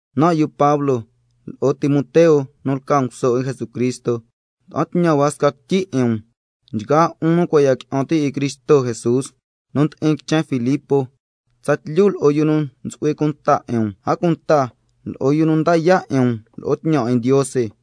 Nan' yu Pablo lo'o Timoteo nu lca nguso 'in Jesucristo, ngua'an tñan hua sca quityi 'in um, nchgaa 'un nu cua' ya qui'an ti' 'in Cristo Jesús nu ndi'in quichen Filipos tsatlyu lo'o yu nu ntsu'hui cunta 'in um, a cunta lo'o yu nu nda yaa' 'in um lo'o tñan 'in Ndiose.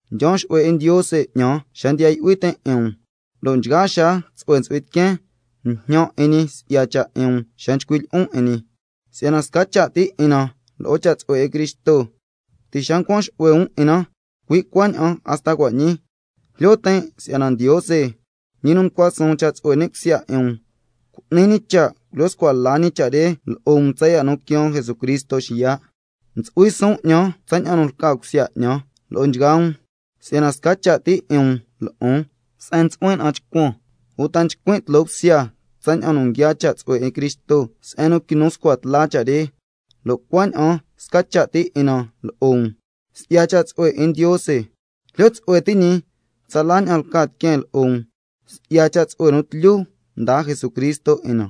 Ndyaan xu'hue 'in Ndiose 'ñan xa ndiya yu'hui tin' 'in um, lo' nchgaa xaa tsu'hue ntsu'hui tiqueen njñan 'in ñi si'ya cha' 'in um xa nchcuin' lyi'on 'in ñi, si'yana sca cha' ti 'in na lo'o cha' tsu'hue 'in Cristo, ti' xa ncuan xu'hue um 'in na, cui' cuaña'an hasta cua' ñii. Jlyo tin' si'yana Ndiose, ñi nu mdyisnan mducua suun cha' tsu'hue ni' cusya 'in um, cu'ni ñi cha' culyo scua la ñi cha' re lo'o um tsaya' nu quiaan Jesucristo xiya'. Ntsu'hui suun 'ñan tsaña'an nu lca cusya 'ñan lo'o nchgaa um, si'yana sca cha' ti 'in um lo'on se'en ntsu'huin na'an chcuan, uta nchcuin' tloo bsya tsaña'an nu nguiaa cha' tsu'hue 'in Cristo se'en nu quinu scua tla cha' re, lo' cuaña'an sca cha' ti 'in na lo'o um si'ya cha' tsu'hue 'in Ndiose. Jlyo tsu'hue ti' ñi tsala ña'an lca tiqueen lo'o um si'ya cha' tsu'hue nu tlyu mdaa Jesucristo 'in na.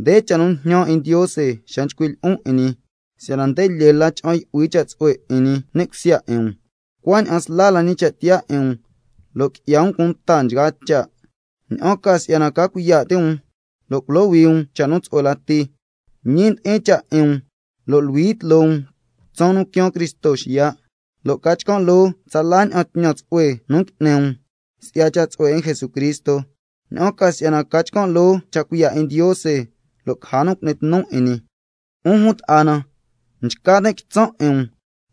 Nde cha' nu njñan 'in Ndiose xa nchcuin' lyi'on 'in ñi, si'yana cha'an yu'hui la cha' tsu'hue 'in ñi ni' cusya 'in um, cuaña'an sla la ñi cha' tiyaa 'in um lo' qui'ya um cunta nchgaa cha', ña'an ca si'yana ca cuiya' ti' um lo' culohui um cha' nu tsu'hue lati, lo' ñi ndi'in cha' 'in um, luhui tloo um tsaan nu ntsu'hui cha' quiaan Cristo xiya', lo' ca chcan' loo tsala ña'an tñan tsu'hue nu ngui'ni um si'ya cha' tsu'hue 'in Jesucristo, cui' si'yana ca chcan' loo cha' cuiya' 'in Ndiose lo' caja nu cu'ni tnu 'in ñi. 'Un jun ta'a na, nchca tin' quitsan' 'in um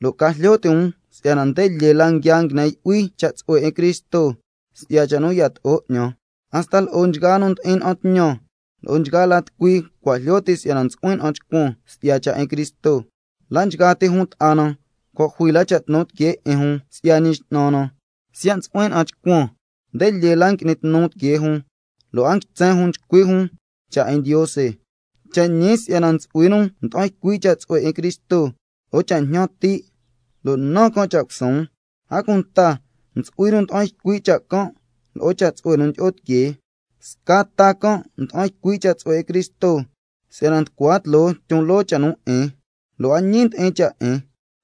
lo' ca jlyo ti' um si'yana nde lyee la nguia nguine yu'hui cha' tsu'hue 'in Cristo si'ya cha' nu yato'o 'ñan. hasta lo'o nchgaa nu ndi'in na'an tñan lo'o nchgaa la tucui cua' jlyo ti' si'yana ntsu'huin na'an chcuan si'ya cha' 'in Cristo. La' nchgaa ti jun ta'a na cua' jui la cha' tnu tiquee 'in jun si'ya Ñi X'nan na, a cunta si'yana ntsu'huin na'an chcuan, nde lyee la ngui'ni tnu tiquee jun lo' a ntsen jun nchcui' jun cha' 'in Ndiose. Cha' ñi si'yana ntsu'hui nu nda'an ycui' cha' tsu'hue 'in Cristo lo'o cha' njñan ti' lo' nan can' cha' cusuun, a cunta ntsu'hui nu nda'an ycui' cha' can' lo'o cha' tsu'hue nu ndyi'o tiquee. Sca ta can' nda'an ycui' cha' tsu'hue 'in Cristo si'yana nducua tloo tyon loo la cha' nu 'in, lo' a ñi ndi'in cha' 'in,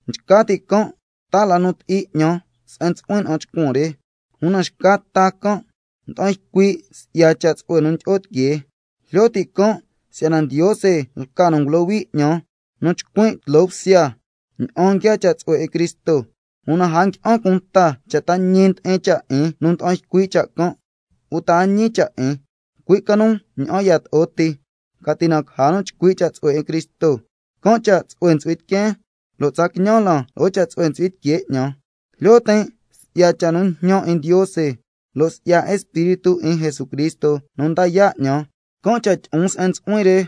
nchca ti' can' taa la nu ti'i 'ñan se'en ntsu'huin na'an chcuan re. Una xca ta can' nda'an ycui' si'ya cha' tsu'hue nu ndyi'o tiquee, jlyo ti' can' si'yana Ndiose lca nu ngulohui 'ñan nu chcuin' tloo bsya tsaña'an nguiaa cha' tsu'hue 'in Cristo. Una a ngui'an cunta cha' ta ñi ndi'in cha' 'in nu nda'an ycui' cha' can' uta a ñi cha' 'in, cui' ca nu ña'an yato'o ti, ca ti caja nu chcui' cha' tsu'hue 'in Cristo, can' cha' tsu'hue ntsu'hui tiqueen, lo' tsa quiñan lan lo'o cha' tsu'hue ntsu'hui tiquee 'ñan. Jlyo tin' si'ya cha' nu njñan um 'in Ndiose, lo' si'ya Espíritu 'in Jesucristo nu nda yaa' 'ñan, can' cha' tyi'on se'en ntsu'huin re,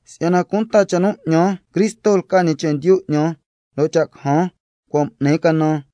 si'yana cunta cha' nu 'ñan Cristo lca ñi chendyu 'ñan, lo' cha' cajan cua' m'nin canan.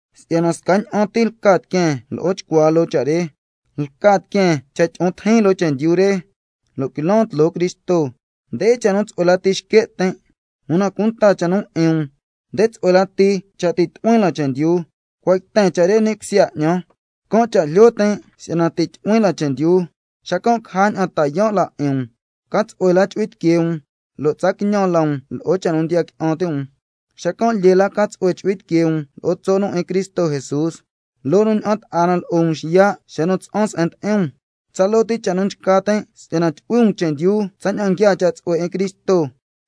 si'yana scaña'an ti lca tiqueen lo'o chcuaa loo cha' re, lca tiqueen cha' tyi'o tijin loo chendyu re lo' quilan tloo Cristo, nde cha' nu tsu'hue lati xque' tin', una cunta cha' nu 'in um, nde tsu'hue lati cha' ti' tyu'huin lan chendyu. Si'yana cua' yten cha' re ni' cusya 'ñan, can' cha' jlyo tin' si'yana ti' tyu'huin lan chendyu, xacan' caja ña'an ta yaan' la 'in um, ca tsu'hue la chu'hui tiquee um lo' tsa quiñan la um lo'o cha' nu ndiya qui'an ti' um, xacan' lyee la ca tsu'hue chu'hui tiquee um lo'o tso' nu 'in Cristo Jesús, loo nu ña'an ta'a na lo'o um xiya' xa nu tsa'an se'en ndi'in um. Tsaloo ti cha' nu nchca tin' si'yana tyu'hui um chendyu tsaña'an nguiaa cha' tsu'hue 'in Cristo,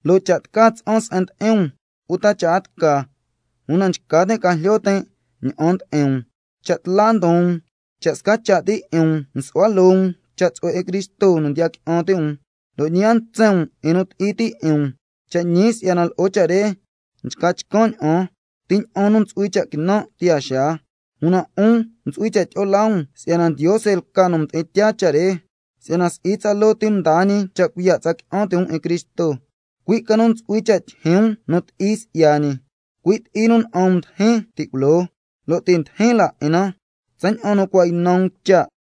lo' cha' tca tsa'an se'en ndi'in um uta cha' a tca, una nchca tin' ca jlyo tin' ña'an ndi'in um, cha' tla ndon um, cha' sca cha' ti 'in um nsu'hua loo um cha' tsu'hue 'in Cristo nu ndiya qui'an ti' um, lo' ñi a ntsen um 'in nu ti'i ti' 'in um. Cha' ñi si'yana lo'o cha' re nchca chcan' ña'an ti ña'an nu ntsu'hui cha' quinan' tiyaa xaa, una 'un ntsu'hui cha' tyi'o laa um si'yana Ndiose lca nu mdi'in tyaa cha' re. Si'yana si'i tsaloo ti mdaa ñi cha' cuiya' tsa qui'an ti' um 'in Cristo, cui' ca nu ntsu'hui cha' tyijyin um nu ti'i si'ya ñi, cui' ti'i nu na'an um mdijin ti' culoo, lo' ti' ndijin la 'in na tsaña'an nu cua' ynan um cha'.